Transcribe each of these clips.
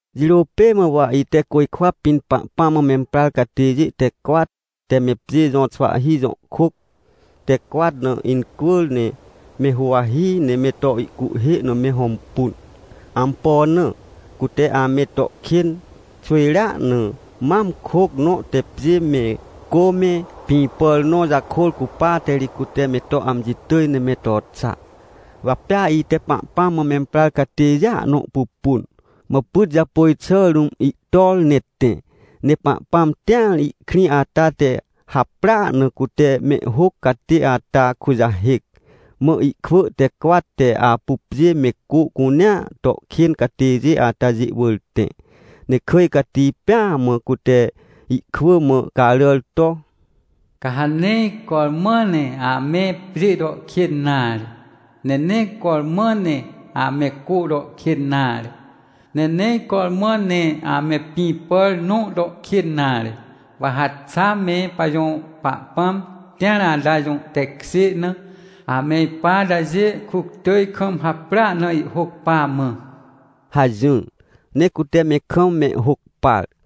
Jirô pê mã wa ite côjkwa pĩn Pahpãm mã memprar catêjê te cwat te me pjê jõ xwahhi jõ kôc te cwat na incwỳr, ne me huwahi, ne me to ihcuhhê na me hõmpun. Ampo na? Cute ame to kên xwỳjrea na mam kôc nõ te pjê me, cô me, pĩ pàr nõ jakôr cupate ri cute me to amji tỳj ne me to xa. Wa pea ite Pahpãm mã memprar catêjêa nõ pupun, mã pyt japôj xà rũm ihtor, ne tẽ. Ne Pahpãm tĩar ihkrĩ ata te haprỳa na cute mehhôc catê ata kujahêc, mã ihkwỳ te cwat te apu pjê me cô cunea to kên catêjê atajê wỳr tẽ. Ne kỳj cati pêa mã cute ihkwỳ mã caràr to: — Ca ha nee cormã ne ame pjê to kên nare, ne nee cormã ne ame cô to kên nare, ne nee cormã ne ame pĩ pàr nõ to kên nare, wa ha xa me pajõ Pahpãm tĩar ata jõ tekjê na ame ipa atajê kuctỳj kam haprỳa na ihhôc pa mã — hajỹr. Ne cute me kam mehhôc par.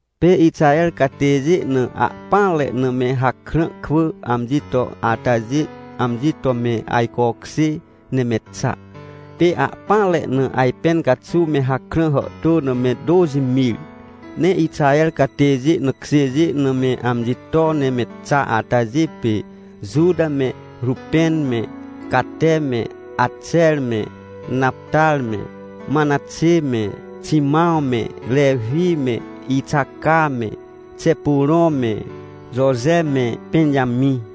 Pê Ixaher catêjê na ahpỹanre na me hakrã kwỳ amji to atajê, amji to me ajcokjê ne me xa, pê ahpỹanre na ajpẽn caxuw me hakrã hàhtô na me tôxi mir. Ne Ixaher catêjê na kjêjê na me amji to ne me xa atajê pê, Juta me, Rupẽn me, Cate me, Axer me, Naptar me, Manaxê me, Ximãw me, Rewi me, Ixaca me, Xepurõ me, Joje me, Pẽnjamĩ.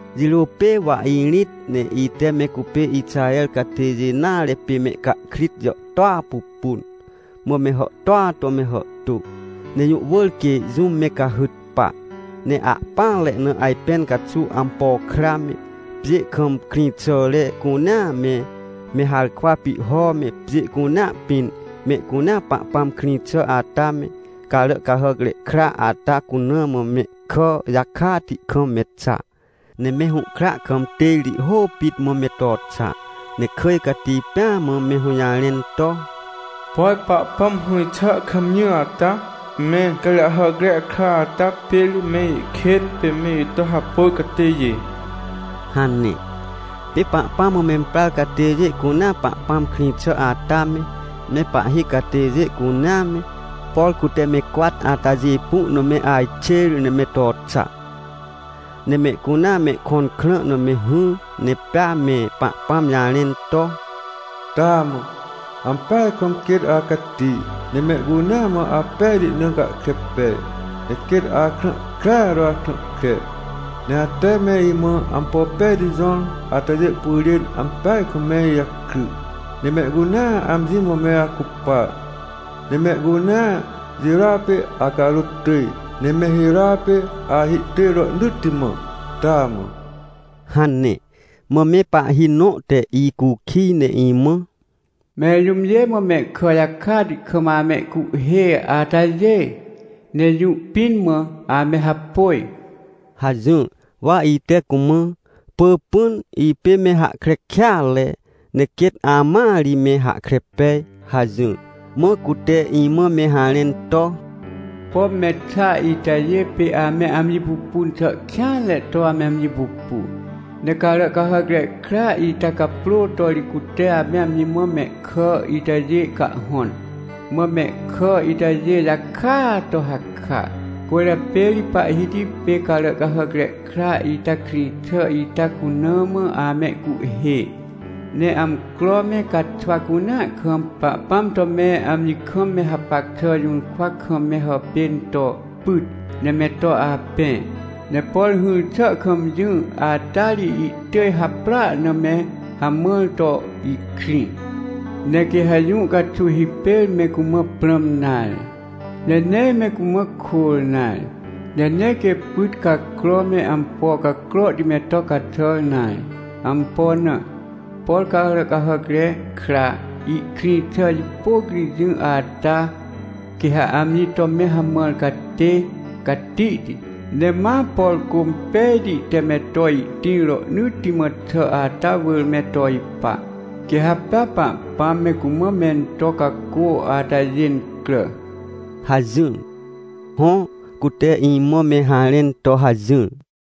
Jirô pê wa irĩt, ne ite me cupê Ixaher catêjê nare pê mehcahkrit jàhtôa pupun. Mã me hàhtôa to me hàhtô, ne jũ wỳr quê jũm me cahyt pa. Ne ahpỹanre na ajpẽn caxuw ampo kra me, pjê kam krĩxàre cunea me, me harkwa pihho me, pjê cunea pĩn mehcunea Pahpãm krĩ xà ata me Caràcahàcre Kra ata cuna mã mehkà jakati kam me xa, ne me hũhkra kam têrti hô pit mã, me to xa. Ne kỳj cati pêa mã me hũjarẽn to: — Por Pahpãm hỹr xà kam jỹ ata, me Caràcahàcre Kra ata pê ri me ikên pê me ito hapôj catêjê — hane. Pê Pahpãm mã memprar catêjê cunea Pahpãm krĩ xà ata me, me pahhi catêjê cunea me, por cute me cwat atajê pu na me ajxê ne me to xa. Ne mehcunea mehkõn krã na me hỹr ne pea me Pahpãm jarẽn to: — Taamã, ampeaj kam quêt acati, ne mehcunea mã apejti na gahkre pej, ne quêt akrã krea to akrã kre. Ne ate me imã ampo pejti jõr atajê pyrên ampeaj kam me ijakry, ne mehcunea amji mã me acupa, ne mehcunea jirôa pê acarôt tỳj, ne me hirôa pê ahihtỳj rohnỳtti mã. Taamã! — hane. Mã me pahhi nõ te icukij ne imã: — Mẽr jũmjê mã mehkà jakati kam amehcuhhê atajê? Ne jũ pĩn mã ame hapôj? — hajỹr. Wa ite cumã: — Pỳpỹn, ipê me hahkre kêatre, ne quêt amãa ri me hahkre pej — hajỹr. Mã cute imã me harẽn to: — Pom me xa itajê pê ame amji pupun xà kêanre to ame amji pupu, ne Caràcahàcre Kra ita caprô to ri cute ame amji mã mehkà itajê cahhõn, mã mehkà itajê jakaa to haka. Cwỳrjapê ri Pahhiti pê Caràcahàcre Kra ita krĩ xà ita cuna mã amehcuhhê, ne amcro me caxwa cunea kam Pahpãm to me amji kam me hapac xà jũrkwa kam me hàpên to pyt, ne me to apẽ, ne por hỹr xà kam jỹ ata ri ihtỳj haprỳa na me hamãr to ihkrĩ. Ne quê ha jũ caxuw hipêr me cumã prãm nare, ne nee me cumã kôr nare. Ne nee quê pyt cacro me ampo cacrohti me to caxàr nare. Ampo na? Por Caràcahàcre Kra ihkrĩ xà jipôc ri jỹ ata, quê ha amji to me hamãr catê catihti, ne ma, por cô impejti te me to ihtĩr rohnỳtti mã xà ata wỳr me to ipa, quê ha pea Pahpãm me cumã mento cacô atajê incrà — hajỹr. Hõ, cute imã me harẽn to hajỹr.